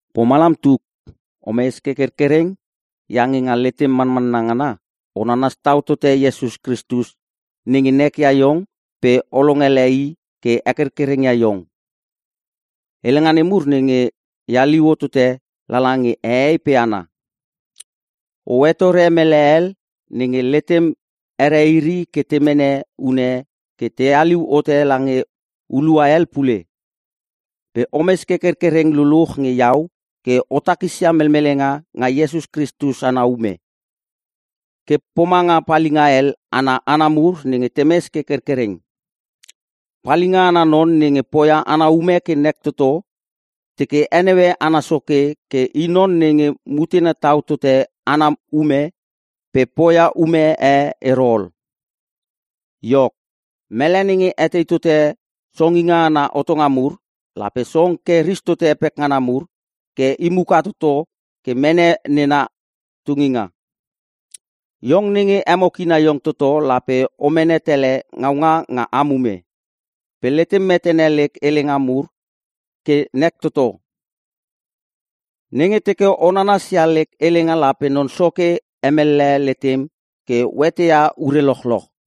Pomalam tuk, o mes ke kerkereng iange nga letem manmanna ngana o nanas tau tote Iesus Kristus nenge nekia iong pe o longele i ke hekerkereng ia iong. Helenga nemur nenge e haliu hotote lala nge hehei pe hana, o hetore mele hel nenge letem here iri ke te mene une ke te haliu hote lange hulua hel pule. Pe omes ke kerkereng luluch nge iau ke o takisia melmelenga nga Iesus Kristus ana ume, ke pomanga palinga hel ana hana mur nge temes ke kerkereng. Palinga ana non nenge poia ana ume ke nek toto, teke heneue ana soke ke i non nenge mutena tau tote ana ume pe poia ume e ero ol. Iok, mele nenge etei tote songinga ana hotonga mur, lape song ke ristote pekngana mur ke i muka toto pe mene nena tunginga. Iong nenge emo kina iong toto lape o mene tele ngaunga nga am ume. Pe letem metene lek helenga mur ke nek toto. Nenge teke o nanasia lek helenga lape Non Soke hemellehe letem ke o eteia ure lochloch.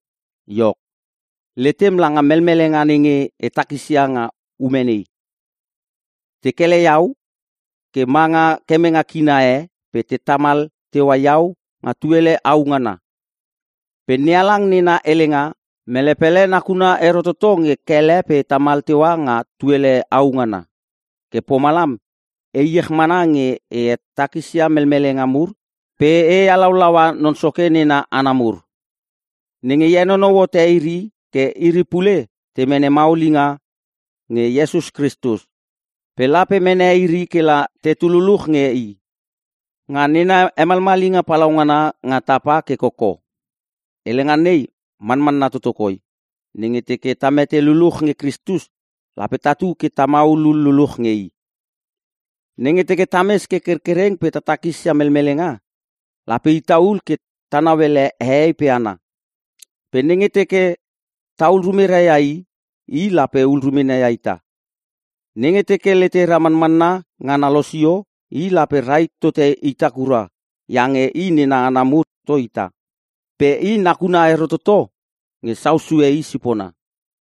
Iok, letem langa melmelenga nenge e takisia nga ume nei. Te kele iau ke manga kemenge kina e pe te tamal teua iau nga tuele au ngana. Pe NeHalang nena helenga, mele pele nakuna ero toto nge kele pe tamal teua nga tuele au ngana. Ke pomalam e iech mana nge e takisia melmelenga mur pe e halaulaua non soke nena hana mur, nenge henonou hote iri ke iri pule te mene maulinga nge Iesus Kristus. Pe lape mene iri kela tetu luluch nge I, nga nena hemalmalinga palaungana nga tapa ke koko. Helenga nei manmanna toto koi: Nenge teke ta mete luluch nge Kristus, lape tatu ke ta maulul luluch nge I. Nenge teke tames ke kerkereng pe ta takisia melmelenga, lape ita ul ke ta nauele hehei pe hana. Pe nenge teke tahul rumera ia i, i lape hul rumena ia ita. Nenge teke letera manmanna ngana losio, I lape rahit tote ita kura iange I nena hana mur toto ita pe I nakuna ero toto nge sau sue i sipona.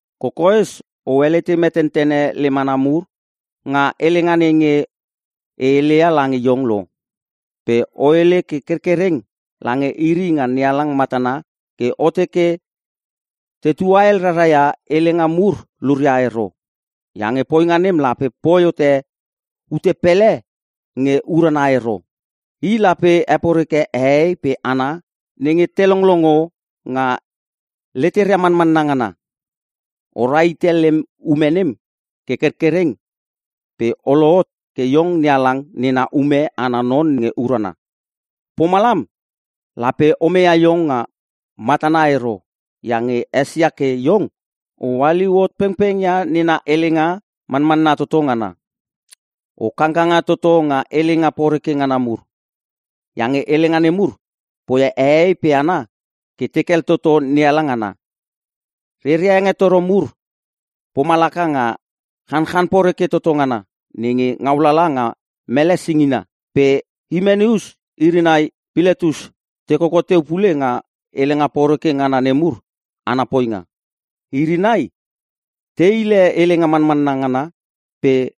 Kokoes o helete metentene lem hana mur nga helenga nenge e heleia lange iong lo. Pe o hele ke kerkereng lange iri nga NeHalang matana ke o teke te tuahel rara ia helenga mur luria ero. Iange poinga nem lape poi hote ute pele nge urana ero, i lape heporeke hehei pe hana nenge te longlongo nga leteria manmanna ngana. O rahite lem ume nem ke kerkerkereng pe o lohot ke iong NeHalang nena ume ana non nge urana. Pomalam lape o meia iong nga matana ero iange esia ke iong o haliu hot pengpengia nena helenga manmanna toto ngana. O kangkanga toto nga helenga poreke ngana mur, iange helenga nemur poia hehei pe hana ke tekel toto NeHalang ana. Reria hengetoro mur pomalaka nga chanchan poreke toto ngana nenge ngaulala nga mele singina. Pe Himenus iri nai Piletus te koko teu pule nga helenga poreke ngana nemur ana poinga. Iri nai te hile helenga manmanna ngana pe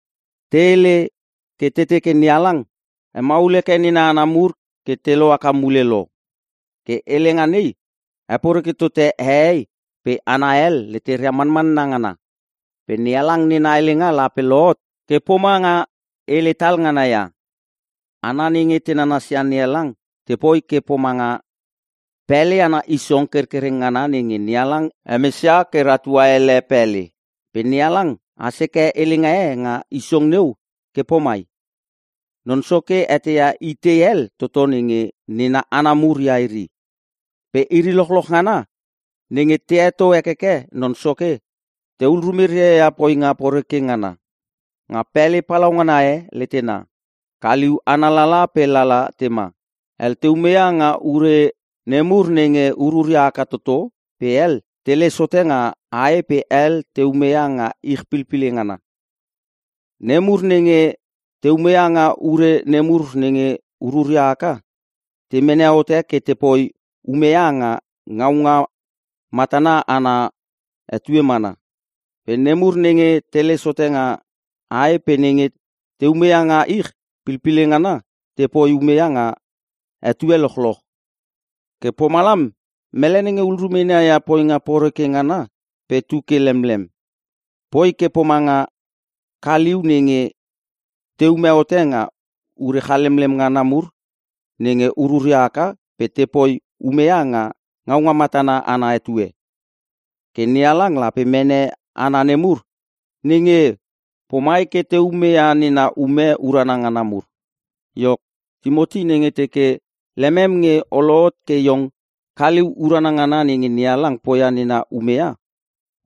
te hele ke te teke NeHalang hemaul heke nena hana mur ke te lohaka mule lo. Ke helenga nei heporeke tote hehei pe hana hel leteria manmanna ngana. Pe NeHalang nena helenga lape lohot ke pomanga hele tal ngana ia. Hana nenge te nanasia NeHalang tepoi ke pomanga pele ana isong kerkereng ngana nenge NeHalang hemesia ke ratua ele pele. Pe NeHalang has heke helenga e nga isong neu ke pomai, “Non Soke eteia itei hel toto nenge nena hana muria iri,” pe “Iri lochloch ngana nenge te heto hekeke Non Soke tehul rumeria ia poinga poreke ngana.” Nga pele palaungana e letena, kaliu ana lala pe lala tema. Hel te umeia nga ure nemur nenge ururia haka toto pe hel teles hote nga ae pe hel te umeia nga ich pilpile ngana. Nemur nenge te umeia nga ure nemur nenge ururia haka, te mene hote ke tepoi umeia nga ngaunga matana ana etue mana. Pe nemur nenge teles hote nga ae pe nenge te umeia nga ich pilpile ngana tepoi umeia nga etue lochloch. Ke pomalam mele nenge hul rumena ia poinga poreke ngana pe tuke lemlem, poi ke pomanga kaliu nenge teume hote nga ure chalemlem ngana mur nenge ururia haka pe tepoi umeia nga ngaunga matana ana etue. Ke NeHalang lape mene hana nemur nenge pomai ke te umeia nena ume urana ngana mur. Iok, Timoti nenge teke lemem nge o lohot ke iong kaliu urana ngana nenge NeHalang poi nena umeia,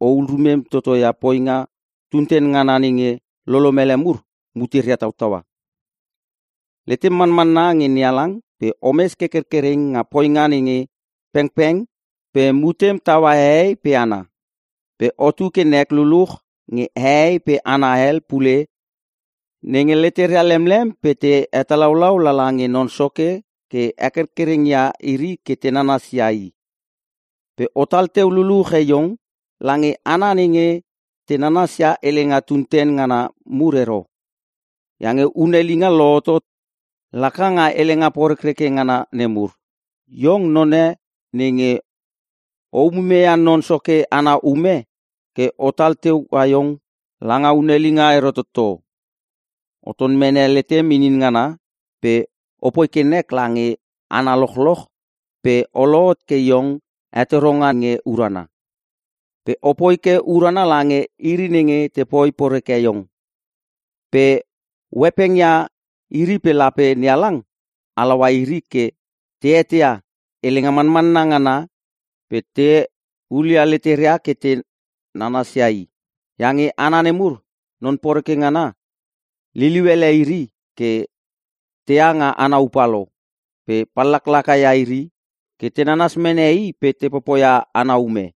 ohul rumem totoia poinga tunten ngana nenge lolomele mur muteria tautaua. Letem manmanna nge NeHalang pe omes ke kerkereng nga poinga nge pengpeng pe mutem taua hehei pe hana. Pe otu ke nek luluch nge hehei pe hana hel pule nenge leteria lemlem pe te hetalaulau lala nge Non Soke ke hekerkereng ia iri ke te nanasia I. Pe otal teu luluche iong lange hana nenge te nanasia helenga tunten ngana mur ero, iange hunelinga lohotot laka nga helenga porekreke ngana nemur. Iong none nenge o umumeia Non Soke ana ume ke otal teua iong langa hunelinga ero toto. O ton mene letem inin ngana pe opoi ke nek lange hana lochloch pe o lohot ke iong hetoronga nge urana. Pe opoi ke urana lange iri nenge tepoi poreke iong, pe o hepengia iri pe lape NeHalang halaua iri ke te eteia helenga manmanna ngana pe te hulia leteria ke te nanasia I. Iange hana nemur non poreke ngana liliu ele iri ke teha nga ana upa lo. Pe pallaklaka ia iri ke te nanas mene i pe te popoia ana ume.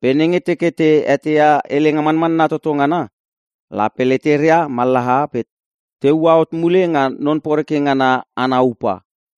Pe nenge teke te eteia helenga manmanna toto ngana, lape leteria mallaha pe te ua hot mule nga non poreke ngana ana upa.